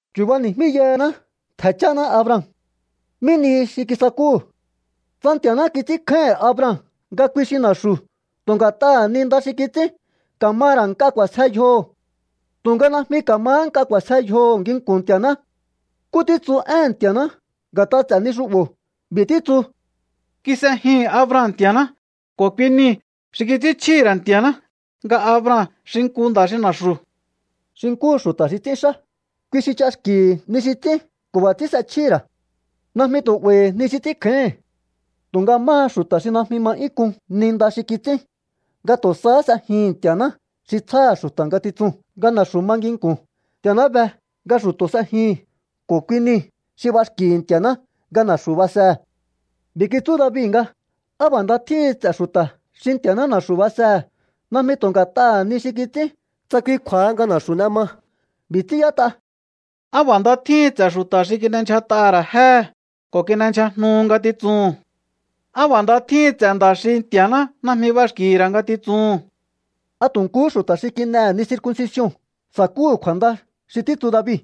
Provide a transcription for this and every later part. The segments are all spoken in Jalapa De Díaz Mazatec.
Chu̱bani̱jmíyahaná ntje̱ cháná Abraham. ¿Mí nihi xi kisakúhu̱? Tsa Nti̱a̱ná kits'ínkjáíhi̱n Abraham nga kui xi na̱xu̱ tu̱ nga̱t'aha̱ ni nda xi kits'ín, ka̱ ma ra̱ nk'a k'u̱a̱sje yjoho̱. Tu̱nga̱ najmi ka̱mahá nk'a k'u̱a̱sje yjoho̱ nginku̱n Nti̱a̱ná. ¿Nkú títsu éhe̱n Nti̱a̱ná nga̱t'a ts'e̱ ni xu'bo̱? B'i̱ títsu: “Kis'ejihi̱n Abraham Nti̱a̱ná ko̱ kui niu̱ xi kits'ínchjíhi̱ ra̱ Nti̱a̱ná nga Abraham xi nku nda̱ xi na̱xu̱.” Xi nkúhu xu̱ta̱ xi ts'ínxá, kui xi ch'axki̱hi̱ ni xi ts'ín ko̱ b'a̱ ts'ín s'echjíhi̱ ra̱. Najmi tu̱ 'ba̱i̱hi̱ ni xi ts'ínkjáíhi̱n. Tu̱nga máha xu̱ta̱ xi najmi ma 'yún k'un ni nda xi kits'ín, nga tu̱ sahá s'ejihi̱n Nti̱a̱ná xi tsjáha̱ xu̱ta̱ ngatitsuu̱n nga na̱xu̱ ma nginku̱n, Nti̱a̱ná be nga xu̱to̱ s'ejihi̱n ko̱ kui niu̱ xi b'axki̱hi̱ Nti̱a̱ná nga na̱xu̱ basehe̱. B'i̱ kitsú David nga: ¡Á b'a̱ nda tjíhin ts'e̱ xu̱ta̱ xi Nti̱a̱ná na̱xu̱ basehe̱, najmi tu̱ nga̱t'aha̱ ni xi kits'ín tsa kui kju̱a̱ha nga na̱xu̱ n'e ma! B'i̱ ts'ín y'ét'a: ¡Á b'a̱ nda tjíhin ts'e̱ xu̱ta̱ xi kin'endyjat'aha̱ ra̱ jéhe̱, ko̱ kin'endyjajnuhu ngatitsuhu̱n! ¡Á b'a̱ nda tjíhin ts'e̱ nda̱ xi Nti̱a̱ná najmi b'axki̱hi̱ ra̱ ngatitsuhu̱n! ¿A tu̱ nkuhú xu̱ta̱ xi kin'ehe̱ ni circuncision sa̱kúhu̱ kju̱a̱nda xi títsu David,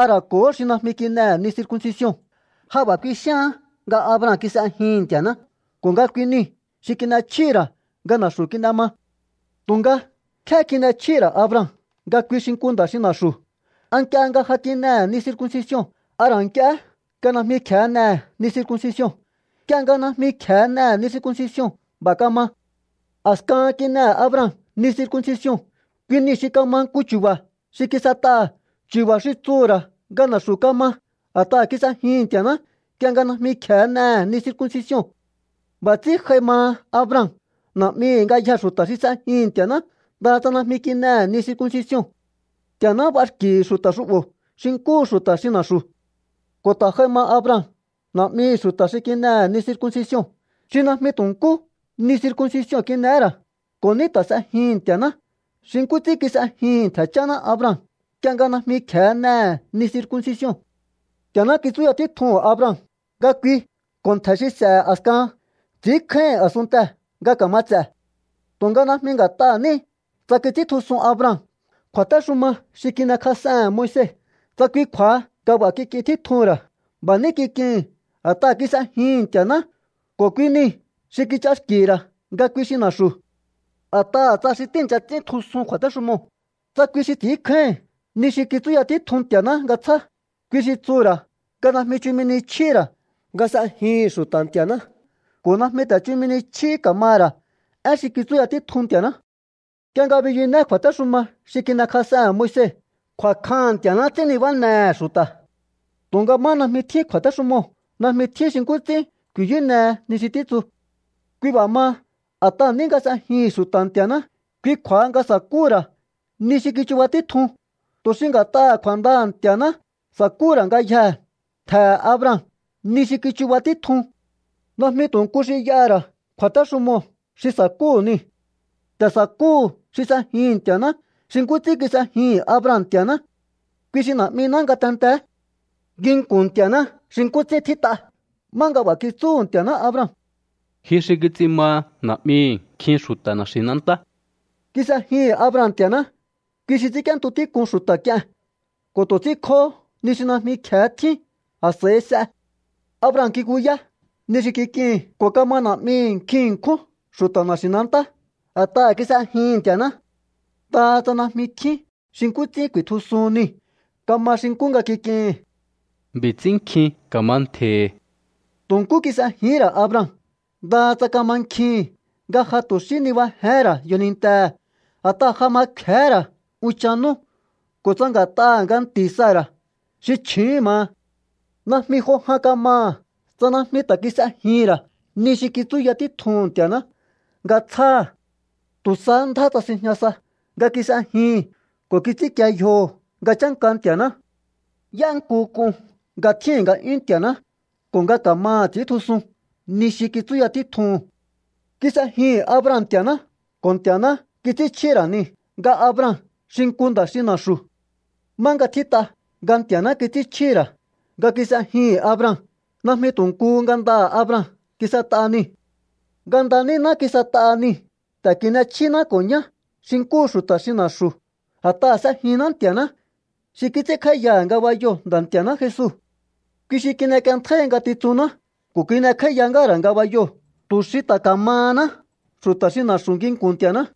a ra̱ ko̱hó xi najmi kin'ehe̱ ni circuncision? Ja b'a̱ kuixíaán nga Abraham kis'ejihi̱n Nti̱a̱ná ko̱ nga kui niu̱ xi kin'echjíhi̱ ra̱ nga na̱xu̱ kin'e ma. Tu̱nga, ¿nkjé kin'echjíhi̱ ra̱ Abraham nga kui xi nku nda̱ xi na̱xu̱? ¿A nk'ie nga ja kin'ehe̱ ni circuncision, a ra̱ nk'ie nga najmi kje̱hé n'ehe̱ ni circuncision? Nk'ie nga najmi kje̱e n'ehe̱ ni circuncision b'a̱ kama. A̱skahan kin'ehe̱ Abraham ni circuncision. Kui niu̱ xi kama nku chu̱ba̱ xi kis'et'aha̱, chu̱ba̱ xi tsuhu̱ ra̱ nga na̱xu̱ kama a̱t'aha̱ kis'ejihi̱n Nti̱a̱ná nk'ie nga najmi kje̱e n'ehe̱ ni circuncision. B'a̱ ts'ín j'ai maha Abraham na̱'mihi̱ ngayjee̱ xu̱ta̱ xi s'ejihi̱n Nti̱a̱ná, ndaha tsa najmi kin'ehe̱ ni circuncision. Nti̱a̱ná b'axki̱hi̱ xu̱ta̱ xu'bo̱ xi nkúhu xu̱ta̱ xi na̱xu̱. Ko̱ ta̱ j'ai ma Abraham na̱'mihi̱ xu̱ta̱ xi kin'ehe̱ ni circuncision, xi najmi tu̱ nkú ni circuncision kin'ehé ra̱, ko̱ ní ta̱ s'ejihi̱n Nti̱a̱ná xi nkú ts'ín kis'ejihi̱n ntje̱ cháná Abraham nk'ie nga najmi kje̱e n'ehe̱ ni circuncision. Nti̱a̱ná kitsúya títjuhu̱n Abraham nga kui ko̱ ntje̱ xi s'e̱he̱ a̱skahan ts'i̱ínkjáíhi̱n a̱sunntee̱ nga ka̱ma ts'e̱. Tu̱nga najmi nga̱t'aha̱ ní tsa kits'íntjusun Abraham kju̱a̱téxuma xi kin'ekjas'ehe̱n Moise, tsa kui kju̱a̱ha nga b'a̱ kik'in títjuhu̱n ra̱. B'a̱ ní kik'ihi̱n a̱t'aha̱ kis'ejihi̱n Nti̱a̱ná ko̱ kui niu̱ xi kich'axki̱hi̱ ra̱ nga kui xi na̱xu̱. A̱t'aha̱ tsa xi tíi̱ncha ts'íntjusun kju̱a̱téxumoo̱, tsa kui xi ts'i̱ínkjáíhi̱n ni xi kitsúya títjun Nti̱a̱ná nga tsjá, kui xi tsuhu̱ ra̱ nga najmi chumi ni chjíhi̱ ra̱ nga s'ejihi̱n xu̱ta̱ Nti̱a̱ná ko̱ najmi ta̱ chumi ni chjí ka̱maha̱ ra̱ én xi kitsúya títjun Nti̱a̱ná. Nk'ie nga biyuné kju̱a̱téxuma xi kin'ekjas'ehe̱n Moise, kju̱a̱kjaha̱n Nti̱a̱ná ts'ín nibánehe̱ xu̱ta̱. Tu̱nga má najmi tjín kju̱a̱téxumoo̱, najmi tjín xi nkú ts'ín ku̱i̱yúnehe ni xi títsu. Kui b'a̱ maha, a̱t'aha̱ ní nga s'ejihi̱n xu̱ta̱ Nti̱a̱ná, kui kju̱a̱ha nga sakúhu̱ ra̱ ni xi kichuba títjun, tu̱ xi nga̱t'aha̱ kju̱a̱ndaha̱ Nti̱a̱ná sakúhu̱ ra̱ ngayjee̱ ntje̱he̱ Abraham ni xi kichuba títjun. Najmi tu̱ nku xi y'aha̱ ra̱ kju̱a̱téxumoo̱ xi sakúhu̱ niu̱. Ta̱ sa̱kúhu̱ xi s'ejihi̱n Nti̱a̱ná xi nkú ts'ín kis'ejihi̱n Abraham Nti̱a̱ná. Kui xi na̱'miná ngatenteé nginku̱n Nti̱a̱ná xi nkú ts'ín tjít'a, má nga b'a̱ kitsúhu̱ Nti̱a̱ná Abraham: “Ji xi kits'in maha na̱'mihi̱ nkjin xu̱ta̱ na̱xi̱nantá.” Kis'ejihi̱n Abraham Nti̱a̱ná, kui xi ts'ínk'íéntu tík'un xu̱ta̱ k'ie̱n ko̱ tu̱ ts'ínkjohó ni xi najmi kje̱e tjín, a̱s'a̱i s'e. Abraham kikuyá ni xi kik'ihi̱n ko̱ kama na̱'mihi̱ nkjin ṉkjún xu̱ta̱ na̱xi̱nantá a̱t'aha̱ kis'ejihi̱n Nti̱a̱ná, ndaha tsa najmi tjín xi nkú ts'ín ku̱i̱tjusuhun niu̱. Kama xi nkú nga kik'ihi̱n: “B'i̱ ts'ín nkjin ka̱ma ntje̱hi̱.” Tu̱ nkú kis'ejihín ra̱ Abraham, ndaha tsa kamankjihi̱n nga ja tu̱ xí nibajehén ra̱ yjonintehe̱ a̱t'aha̱ ja ma kfe̱hé ra̱ unchan nú ko̱ tsa nga̱t'aha̱ nga nti̱ Sara̱ xi chju̱úhu̱n maha. Najmi jo jan kamaha̱ tsa najmi ta̱ kis'ejihi̱n ra̱ ni xi kitsúya títjuhu̱n Nti̱a̱ná nga tsjáha̱. Tu̱ sahá ndjá tsasinjña sa nga kis'ejihi̱n ko̱ kits'ínkie yjoho̱ nga chánka Nti̱a̱ná. Y'énku k'un nga tjíhi̱n nga'yún Nti̱a̱ná ko̱ nga ka̱maha̱ ts'i̱íntjusun ni xi kitsúya títjuhu̱n. Kis'ejihi̱n Abraham Nti̱a̱ná ko̱ Nti̱a̱ná kits'ínchjíhi̱ ra̱ niu̱ nga Abraham xi nku nda̱ xi na̱xu̱. Má nga tjít'a nga Nti̱a̱ná kits'ínchjíhi̱ ra̱ nga kis'ejihi̱n Abraham, najmi tu̱ nkuhú ngandaha̱ Abraham kis'et'a niu̱. Nganda níná kis'et'aha niu̱. Ta̱ n'e̱chjíná ko̱ ñá xi nkúhu xu̱ta̱ xi na̱xu̱ a̱t'aha̱ s'ejinná Nti̱a̱ná xi kits'ínkj'áíyaha̱ ngabayoo̱ Nda̱ Nti̱a̱ná Jesu. Kui xi kin'ek'ienntjáíhi ngatitsunná ko̱ kin'ekj'áíya ngáha̱ ra̱ ngabayoo̱ tu̱ xi ta̱ ka̱mahaná xu̱ta̱ xi na̱xu̱ nginku̱n Nti̱a̱ná.